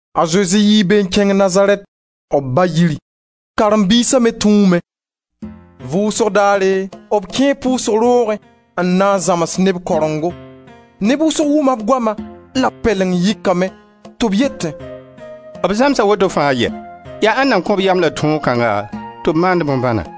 A Zezi yii be n kẽng Nazarɛt, b ba-yiri. Karen-biisa me tũume. Vʋʋsg daare b kẽe pʋʋsg roogẽ n na n zãms neb karengo. Neb wʋsg wʋma b goama la b pɛleng yɩkame tɩ b yetẽ: «B zãmsa woto fãa yɛ? Ya ãnna kõ-b yam la tõog kãngã tɩ b maand bõn-bãna?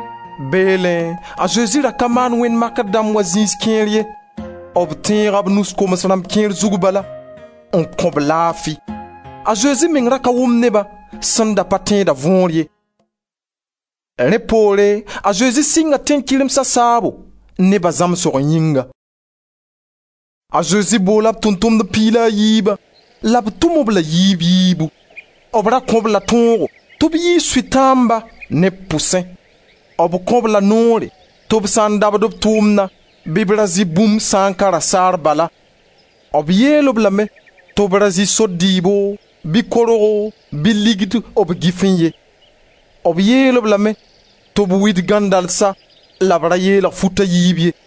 Beelẽ a Zezi ra ka maan wẽnd-makr dãmb wa zĩis kẽer ye. B tẽega b nus koms-rãmb kẽer zug bala, n kõ-b laafi. A Zezi meng ra ka wʋmd neba sẽn pa tẽeda võor ye. Piig la a yiiba tʋmbo Rẽ poore a Zezi sɩnga tẽn-kɩremsa saabo, neba zãmsg yĩnga. A Zezi boola b Tʋʋm-tʋmdb piig la a yiibã la b tʋm-b la a yiib-yiibu; b ra kõ-b la tõogo tɩ b yiis sʋtãamba neb pʋsẽ. B kõ-b la noore tɩ b sã n dabd b tʋʋmna bɩ b ra zɩ bũmb sã n ka rasaar bala. B yeel-b lame tɩ ra zɩ sor dɩɩbo, bɩ korgo, bɩ ligd b gɩfẽ ye. B yeel-b lame tɩ b wid gãndalsa, la b ra yeelg fut a yiib ye.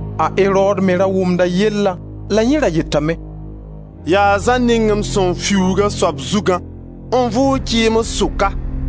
A Erod me ra wʋmda b yelle la yẽ ra yetame: «Yaa Zã ning m sẽn fiuug a soab zugã, n vʋʋg kɩɩms sʋka!»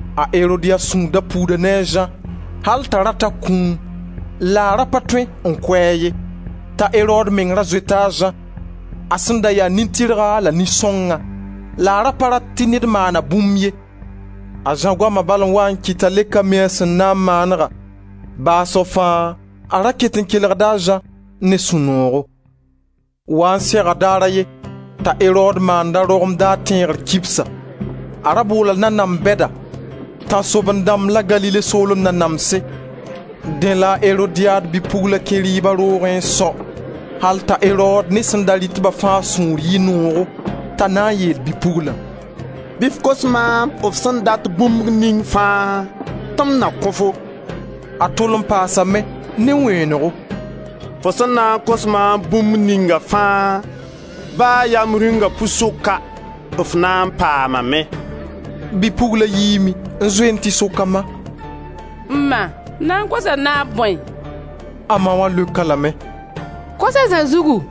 A Erodiad sũur da puuda ne a Zã, al t'a da rat a kũum, la a ra pa tõe n kʋ-a ye, t'a Erod meng ra zoeta a Zã, a sẽn da ya nin-tɩrga la nin-sõngã, la a ra pa rat tɩ ned maan-a bũmb ye. A Zã goama bal n wa n kɩt t'a le ka mi a sẽn na n maanega. Baasg fãa, a ra ket n kelgda a Zã ne sũ-noogo. Waa n sega daar a ye, t'a Erod maand a rogem daar tẽegr kibsa. A ra boola nanams bɛda, tãnsoabẽn-dãmb la Galile soolem nanamse. Dẽ la a Erodiad bi-pugla kẽ rɩɩba roogẽ n sao, al t'a Erod ne sẽn da rɩt-ba fãa sũur yɩ noogo t'a na n yeel bi-puglã: «Bɩ f kos maam f sẽn dat bũmb ning fãa, tɩ m na kõ-fo.» A tol n paasame ne wẽenego: «Fo sẽn na n kos maam bũmb ninga fãa, ba yaa m rĩunga pʋɩ-sʋka, f na n paamame.» Bi-pugla yiime n zoe n tɩ sok a ma: «M ma, m na n kosa naab bõe?» A ma wã leokame: «Kos a Zã zugu.»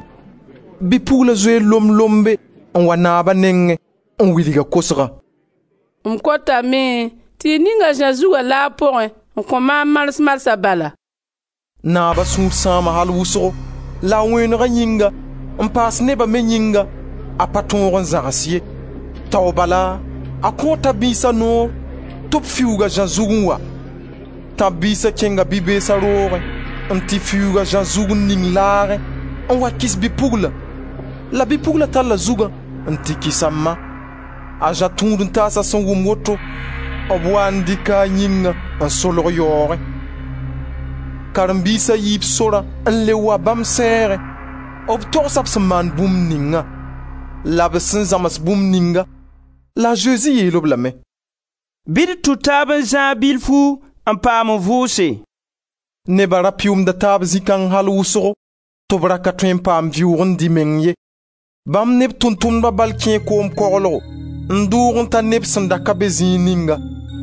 Bi-pugla zoe lomb-lombe, n wa naaba nengẽ n wilg a kosgã: «M kotame tɩ y ning a Zã zugã laag pʋgẽ n kõ maam mars-marsã bala.» Naaba sũur sãama al wʋsgo, la a wẽenega yĩnga, n paas neba me yĩnga, a pa tõog n zãgs ye. Tao bala, a kõo tãb-biisa noor tɩ b fiuug a Zã zug n wa. Tãb-biisa kẽnga bi-beesa roogẽ n tɩ fiuug a Zã zug n ning laagẽ, n wa kɩs bi-puglã. La bi-pugla talla zugã n tɩ kɩs a ma. A Zã tũud-n-taas sẽn wʋm woto, b waa n dɩka a yĩngã n solg yaoogẽ. Karen-biisa yii b sorã n le wa bãmb sɛɛgẽ. B togsa b sẽn maan bũmb ninga, la b sẽn zãms bũmb ninga. La a Zezi yeel-b lame: «Bɩ d tũ taab n zãag zĩig bilfu n paam n vʋʋse.» Neba ra pɩʋʋmda taab zĩ kãng al wʋsgo, tɩ b ra ka tõe n paam vɩʋʋg n dɩ meng ye. Bãmb ne b Tʋʋm-tʋmdbã bal kẽe koom koglgo, n dʋʋg n ta neb sẽn da ka be zĩig ninga.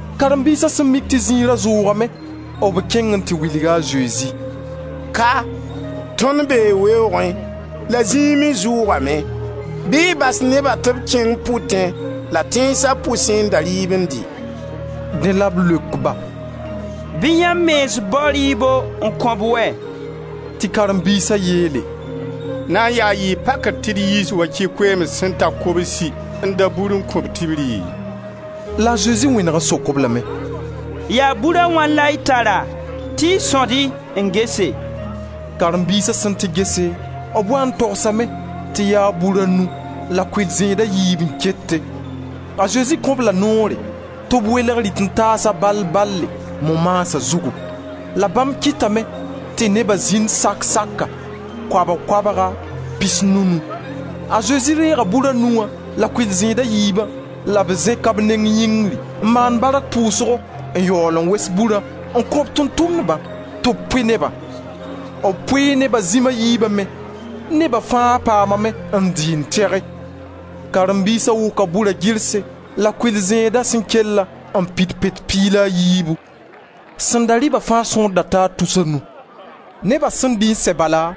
Karen-biisa sẽn mik tɩ zĩiga ra zʋʋgame, b kẽng n tɩ wilg a Zezi: «Ka, tõnd bee weoogẽ, la zĩig me zʋʋgame. Bɩ y bas neba tɩ b kẽng pʋtẽ la tẽnsa pʋsẽ n da rɩɩb n dɩ.» Dẽ la b leok ba: «Bɩ yãmb mens bao rɩɩbo n kõ-b wɛ!» Tɩ karen-biisa yeele: «Na yaa n yɩ pakr tɩ d yiis wakɩ koeems sẽn ta kobsi n da bur n kõ-b tɩ b rɩ?» La a Zezi wẽneg n sok-b lame: «Yaa bur a wãna la y tara, tɩ sõd-y n gese.» Karen-biisa sẽn tɩ gese, b waa n togsame tɩ yaa bur a nu la kʋɩl-zẽed a yiib n kete. A Zezi kõ-b la noore tɩ b welg rɩt-n-taasa bal bale, mo maasa zugu. La bãmb kɩtame tɩ neba zĩnd sak saka, koabg koabga, pisnu-nu. A Zezi deega bur a nu wã la kʋɩl-zẽed a yiibã, la b zẽka b neng yĩngr n maan bark pʋʋsgo n yaool n wes burã n kõ Tʋʋm-tʋmdbã tɩ b pʋɩ nebã. B pʋɩ neba zĩm a yiiba me. Neba fãa paamame n dɩ n tɩge. Karen-biisa wʋka bura girse la kʋɩl-zẽedã sẽn kellã n pid pet piig la a yiibu. Sẽn da rɩba fãa sõor taa tus a nu. Neba sẽn dɩ n sɛ bala,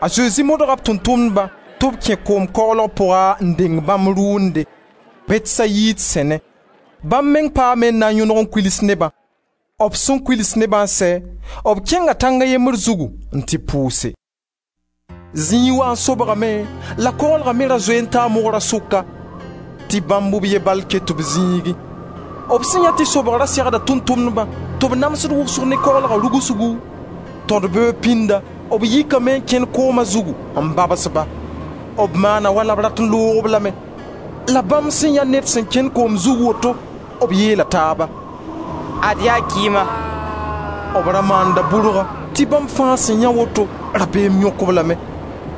a Zezi modga b Tʋʋm-tʋmdbã tɩ b kẽ koom koglga pʋga n deng bãmb rʋʋnde, Bɛtsayid sẽnẽ. Bãmb meng paame n na n yõdg n kuls nebã. B sẽn kuls nebã n sɛ, b kẽnga tãng a yembr zugu n tɩ pʋʋse. Zĩig waa n sobgame, la koglga me ra zoe n taa mogra sʋka, tɩ bãmb b ye bal ket b zĩigẽ. B sẽn yãe tɩ sobg ra segda Tʋʋm-tʋmdba tɩ b namsd wʋsg ne koglga rʋgsgu, tõd-beoog pĩnda, b yikame n kẽn kooma zug n babs-ba. B maana wala b da rat n loog-b lame. La bãmb sẽn yãe ned sẽn kẽnd koom zug woto, b yeela taaba: «Ad-y yaa kɩɩma!» B ra maanda bʋrga tɩ bãmb fãa sẽn yãe woto, rabeem yõk-b lame.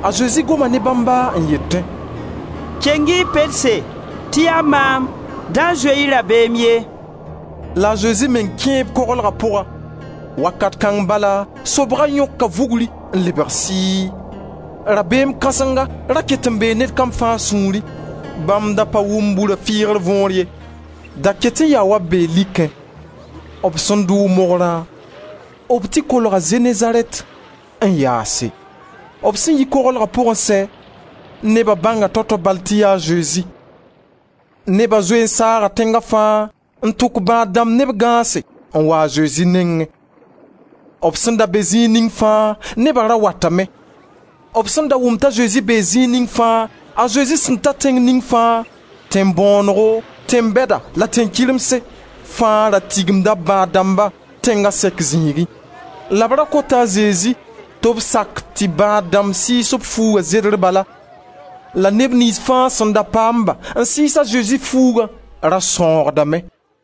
A Zezi goma ne bãmba n yetẽ: «Keng-y y pelse, tɩ yaa maam; da zoe-y rabeem ye.» La a Zezi meng kẽe b koglga pʋga. Wakat kãng bala sobga yõka vugr n lebg sɩɩ. Rabeem kãsenga da ket n bee ned kam fãa sũurẽ. Bãmb da pa wʋm bura fɩɩr võor ye, da ket n yaa wa b bee likẽ. B sẽn dʋʋg mogrã, b tɩ kolga Zenezarɛt n yaase. B sẽn yi koglga pʋg n sɛ, neba bãnga tao-tao bal tɩ yaa a Zezi. Neba zoe n saaga tẽnga fãa n tʋk bãad-dãmb ne b gãase n wa a Zezi nengẽ. B sẽn da be zĩig ning fãa, neba ra watame. B sẽn da wʋm t'a Zezi bee zĩig ninga fãa, a Zezi sẽn ta tẽng ning fãa, tẽn-bõonego, tẽn-bɛda la tẽn-kɩremse, fãa ra tigimda b bãad-dãmba, tẽnga sɛk zĩigẽ, la b ra kota a Zezi tɩ b sak tɩ bãad-dãmb sɩɩs b fuuga zerd bala. La neb niins fãa sẽn da paam-ba n sɩɩs a Zezi fuuga ra sãoogdame.